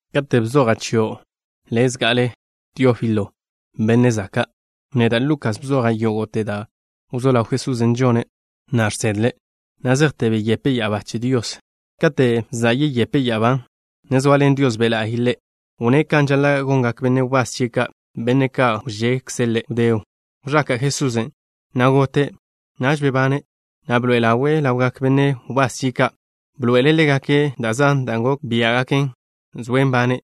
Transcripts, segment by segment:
Kate' bzoja' chio' le' zga'ale, Teófilo, benne' zaka', neda', Lukas, bzoja' yógo'te da' wzó ḻaw Jesusen' žone', na' žsedle', na' zejte beyepe' ya'abá che Dios. Kate' za' yeyepe' ya'abán', ne zoaḻen Dios Be' La'y Ḻe', wnné' kan žaḻa' gongak benne' wbás chie' ka', benne' ka' wžekze' Ḻe'. Wdé wẕaka' Jesusen', na' gote'. Naž bebane', na' bḻoe'e ḻawe' ḻawgak benne' wbás chie' ka'. Bḻoe'ele' ḻégake' da' zan da' gok biá'gaken zoe' nbane',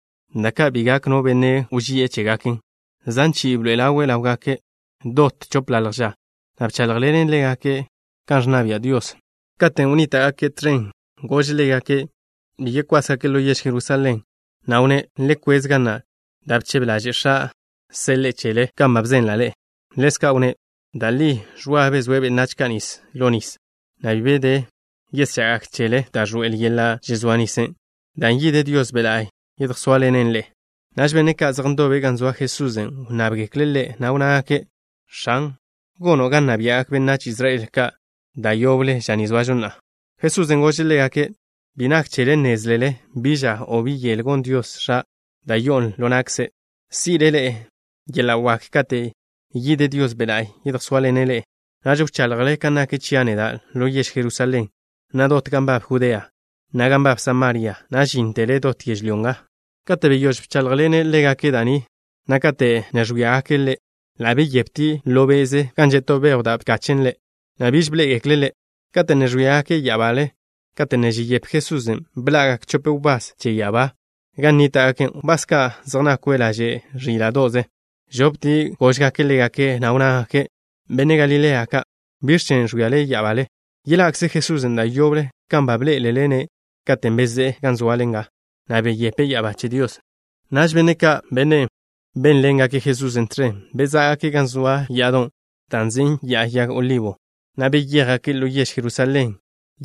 da' ka' bi gak no benne' wži'e chégaken. Zan chi'i bḻoe'e ḻawe' ḻáwgake' dot chopḻalj ža, na' bcháḻjḻene' ḻégake' kan ẕnna bia' Dios. Katen' wnníta'gake' tẕen, gože' ḻégake' bi yekwásgake' ḻo yež Jerusalén, na' wnné': —Le kwez ga na' da' bchebe ḻaže' X̱a' seḻe'e chele, kan ba bzenla' ḻe'e. Ḻezka' wnné': —Da' li Ẕwa bezóe' benách ka' nis ḻo nis, na' bi de yeschá gak chele da' ẕḻoe'el yeḻa' žezóa nisen', dan' yide Dios Be' La'y yedjsóaḻene' ḻe'e. Naž benne' ka' zej ndobe' gan zoa Jesusen' wnnábgekle' Ḻe', na' wnnágake': —X̱an, ¿gono' ga nna bia'gak benách Israel ka' da' yoble ža ni zoažo na'a? Jesusen' gože' ḻégake': —Bi nak chele nnézlele bi ža o bi yel gon Dios X̱a', da' yo'on ḻo na'kze'. Si'le ḻe'e yeḻa' wak kate' yide Dios Be' La'y yedjsóaḻene' ḻe'e. Naž wchaḻjle kan nak chia' neda' ḻo yež Jerusalén, na' dot gan nbab Judea, na' gan nbab Samaria, na' ga žíntele dot yežlyó nga. Kate' beyóž bcháḻjḻene' ḻégake' da' ni, na' kate' ne ẕwíagake' Ḻe', ḻa' beyeptie' ḻo be'ze gan že' to bejw da' bkachen' Ḻe', na' biž bḻé'egekle' Ḻe'. Kate' ne ẕwíagake' ya'abale kate' ne žeyepe Jesusen', bḻa'gak chope wbás che ya'abá ka' gan nníta'gake', wbás ka' zej nakwe' laže' ẕíla'do'ze. Ẕoptie' góžgake' ḻégake', na' wnnágake': —Benne' Galilea ka', ¿biẕ chen' ẕwíale ya'abale? Yeḻa'kze Jesusen' da' yoble kan ba bḻé'elele-ne' katen' bezé'e gan zoale nga, na' beyepe' ya'abá che Dios. Naž benne' ka', benne' bénḻengake' Jesusen' tẕen, bezá'gake' gan zoa ya'adon' da' nzin' Ya'a Yag Olibo, na' beyéjgake' ḻo yež Jerusalén.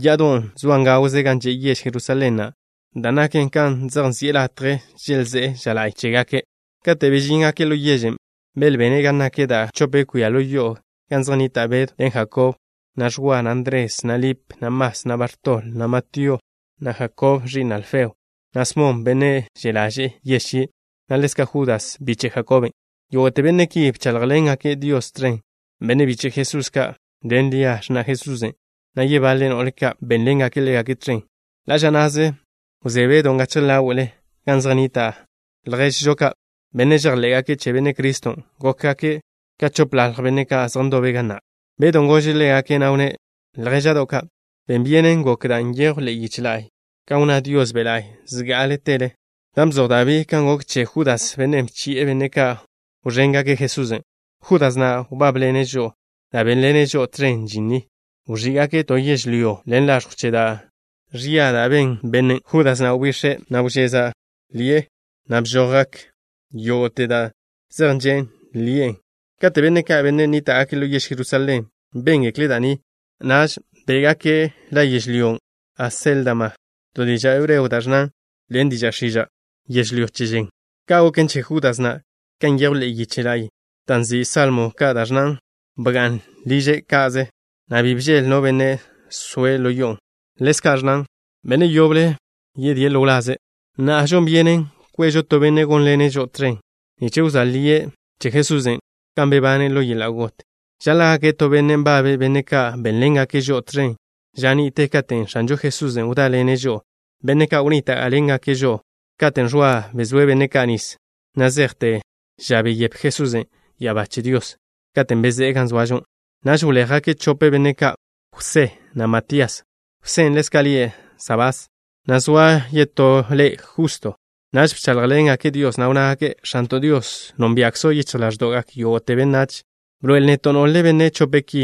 Ya'adon' zoan gawze gan že' yež Jerusalén na', da' naken kan zej nzi'e latje želzé'e ža la'y chégake'. Kate' bežíngake' ḻo yežen', belbene' gan nak da' chope kwia ḻo yo'o, gan zej nnita' Bedw ḻen Jakob, na' Ẕwa, na' Ndres, na' Lip, na' Mas, na' Bartol, na' Matío, na' Jakob, ẕi'n Alfeo, na' Smon, bennen' že' ḻaže'e yež chie', na' ḻezka' Judas, biche' Jakoben'. Yógo'te benne' ki bcháḻjḻengake' Dios tẕen. Benne' biche' Jesús ka' ḻen Lia, x̱na' Jesusen', na' yebaḻe no'le ka', bénḻengake' ḻégake' tẕen. Ḻa' ža na'ze wzé Bedon' gachje ḻáwe'le gan zej nnita' lježžo ka', benne' žejḻé'gake' che Benne' Criston'. Gokgak ka x̱opḻalj benne' ka' zej ndobe' ga na'. Bedon' gože' ḻégake', na' wnné': —Ljéža'do' ka'. Ben byenen gok da' nyejw ḻe'e yiche la'y, kan wnná Dios Be' La'y zgá'atele, dan' bzoj Dabí kan gok che Judas, bennen' bchi'e benne' ka' wẕéngake' Jesusen'. Judas na' wbábḻene' žo'o, na' bénḻene' žo'o tẕen žin ni. Wẕí'gake' to yežlyó ḻen laẕjw che da' ẕia da' ben bennen'. Judas na' wbix̱e', na' wžeza' ḻi'e, na' bžojgak yógo'te da' zej že' ḻi'e. Kate' benne' ka', benne' nníta'gake' ḻo yež Jerusalén béngekle' da' ni, naž bé'gake' la yežlyón' Aséldama, to diža' hebreo da' ẕnnan ḻen diža' x̱iža': “Yežlyó Che Žen.” Ka' goken che Judas na', kan nyejw ḻe'e yiche la'y da' nzin' Salmo Ka', da' ẕnnan: Bga'n liže' ka'ze, na' bi bžeḻ no benne' zoe' ḻo yo'on'. Ḻezka' ẕnnan: Benne' yoble yedíe' ḻo wlaze'. ’Na'a žon byenen kwežo to benne' gónḻene' žo'o tẕen nich wzóa lie' che Jesusen', kan bebane' ḻo yeḻa' got. Žaḻa' gake' to benne' nbabe' benne' ka' bénḻengake' žo'o tẕen ža ni'te katen' X̱anžo Jesusen' wdáḻene' žo'o, benne' ka' wnníta'ḻengake' žo'o katen' Ẕwa bezóe' benne' ka' nis, na' zejte ža beyepe Jesusen' ya'abá che Dios, katen' bezé'e gan zoažo. Naž wléjgake' chope benne' ka', Jwsé, na' Matías. Jwsén' ḻezka' lie' Sabás, na' zoa yetó ḻe' Justo. Naž bcháḻjḻengake' Dios, na' wnnágake': —X̱anto' Dios, nónbia'kzo' yichj ḻáẕdo'gak yógo'te benách. Bḻoe'el neto' nole benne' chope' ki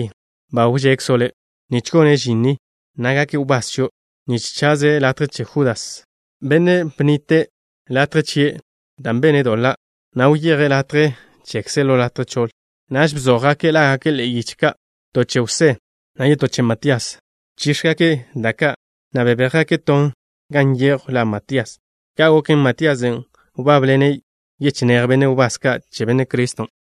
ba wžekzo' Le', nich gone' žin ni, na' gake' wbás chio', nich chaze' latje che Judas, bennen' bnite' latje chie' dan' bene' doḻa', na' wyeje' latje chekze' ḻo latje choḻ. Naž bzójgake' lágake' ḻe'e yiche ka', to che Jwsé, na' yetó che Matías. Bchíx̱egake' da' ka', na' bebéjgake' ton, gan nyejw la Matías. Ka' goken, Matíasen' wbábḻene' yechinéj benne' wbás ka' che Benne' Criston'.